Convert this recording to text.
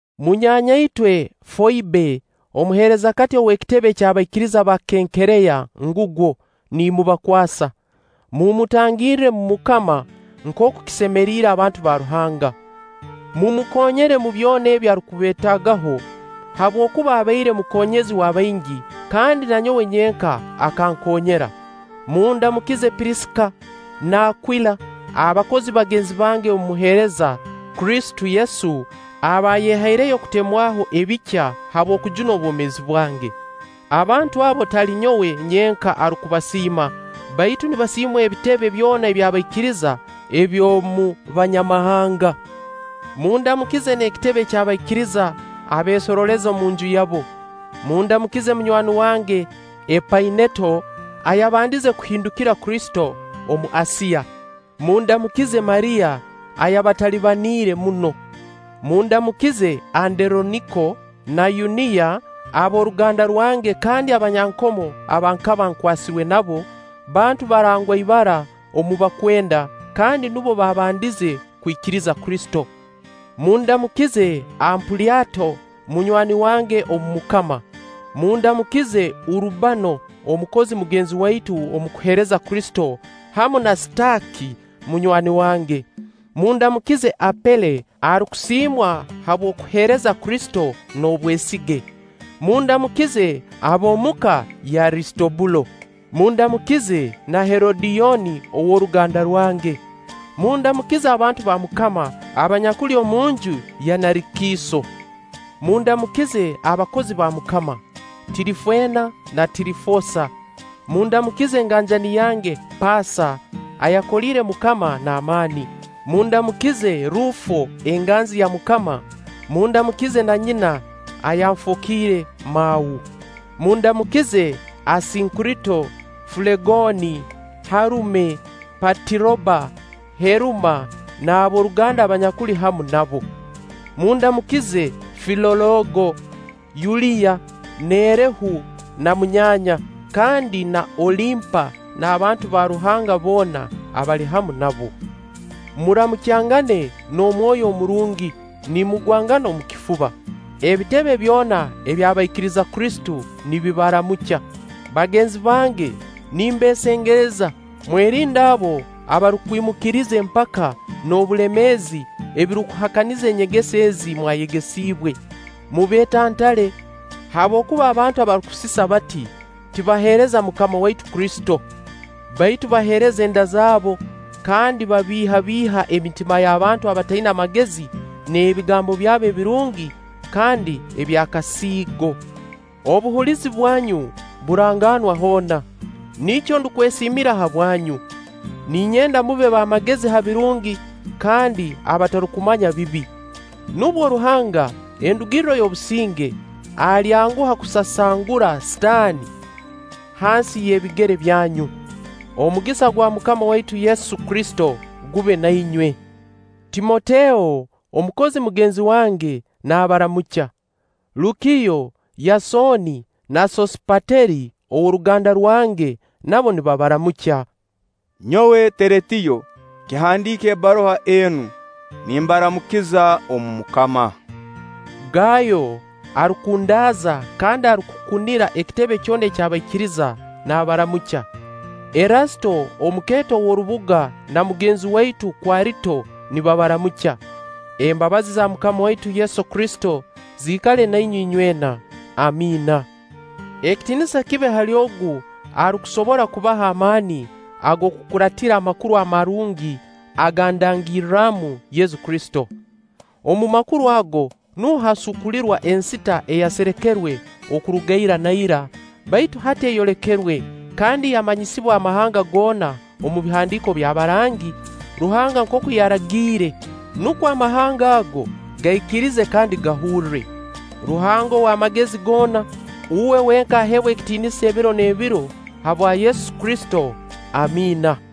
Munyaanya-itwe Foibe, omuheerezakati ow'ekitebe ky'abaikiriza ba Kenkereya ngugwo, niimubakwasa. Mumutangirre omu Mukama nkooku kisemeriire abantu ba Ruhanga. Mumukoonyere omu byona ebi arukubeetaagaho, habwokuba abaire mukoonyezi w'abaingi kandi na nyowe nyenka akankoonyera. Mundamukize Pirisika n'Akwila, abakozi bagenzi bange omu kuheereza Kristo Yesu, abaayehaireyo okutemwaho ebikya habw'okujuna obwomeezi bwange. Abantu abo tali nyowe nyenka arukubasiima, baitu nibasiimwa ebitebe byona eby'abaikiriza eby'omu Banyamahanga. Mundamukize n'ekitebe ky'abaikiriza abeesorooleza omunju yabo. Mundamukize munywani wange Epaineto, ayabandize kuhindukira Kristo omu Asiya. Mundamukize Mariya ayabatalibaniire muno. Mundamukize Anderoniko na Yuniya ab'oruganda rwange kandi abanyankomo aba nkaba nkwasirwe nabo; bantu barangwa ibara omu bakwenda kandi nubo bambandize kwikiriza Kristo. Mundamukize Ampulyato, munywani wange omu MUKAMA. Mundamukize Urubano, omukozi mugenzi waitu omu kuheereza Kristo, hamu na Sitaaki munywani wange. Mundamukize Apele arukusiimwa habw'okuheereza Kristo n'obwesige. Mundamukize ab'omu ka y'Arisitobulo. Mundamukize na Herodiyoni ow'oruganda rwange. Mundamukize abantu ba MUKAMA abanyakuli omunju ya Narikiiso. Mundamukize abakozi ba MUKAMA: Tirifeena na Tirifoosa. Mundamukize enganjani yange Paasa ayakoliire MUKAMA n'amaani. Mundamukize Ruufo enganzi ya Mukama, mundamukize na nyina ayanfookiire mau. Mundamukize Asinkurito, Fulegooni, Herume, Patiroba, Heruma, n'ab'oruganda abanyakuli hamu nabo. Mundamukize Filoologo, Yuliya, Nerehu na munyaanya, kandi na Olimpa n'abantu ba Ruhanga boona abali hamu nabo. Maramukyangane n'omwoyo omurungi nimugwangana omu kifuba. Ebitebe byona eby'abaikiriza Kristo nibabaramukya. Bagenzi bange nimbeesengereza, mwerinde abo abarukwimukiriza empaka n'obulemeezi ebirukuhakaniza enyegesa ezi mwayegesiibwe; mubeetantale. Habwokuba abantu abarukusisa bati, tibaheereza MUKAMA waitu Kristo, baitu baheereza enda zaabo; kandi babiihabiiha emitima y'abantu abataina magezi n'ebigambo byabo ebirungi kandi eby'akasiigo. Obuhulizi bwanyu burangaanwa hoona, nikyo ndukwesiimira habwanyu. Ninyenda mube b'amagezi ha birungi kandi abatarukumanya bibi. Nubwo Ruhanga, endugirro y'obusinge, alyanguha kusasangurra Sitaani hansi y'ebigere byanyu. Omugisa gwa MUKAMA waitu Yesu Kristo gube na inywe. Timoteo, omukozi mugenzi wange, nabaramukya. Lukiyo, Yasooni, na Sosiipateri ow'oruganda rwange nabo nibabaramukya. Nyowe Teretiyo, kihandiika ebbaruha enu, nimbaramukiza omu MUKAMA. Gaayo arukundaaza kandi arukukunira ekitebe kyona eky'abaikiriza, naabaramukya. Erasito omukeeto w'orubuga na mugenzi waitu Kwarito nibabaramukya. [Embabazi za MUKAMA waitu Yesu Kristo zikale na inywe inywena. Amiina.] Ekitiinisa kibe hali Ogu arukusobora kubaha amaani ag'okukuraatira Amakuru Amarungi aga ndangirramu Yesu Kristo. Omu Makuru ago nuho hasuukulirwa ensita eyaserekerwe okuruga ira na ira, baitu hati eyolekerwe kandi yamanyisibwa amahanga goona omu Bihandiiko by'abarangi, Ruhanga nkooku yaragiire, nukwo amahanga ago gaikirize kandi gahurre. Ruhanga ow'amagezi goona, Uwe wenka aheebwe ekitiinisa ebiro n'ebiro habwa Yesu Kristo! Amiina.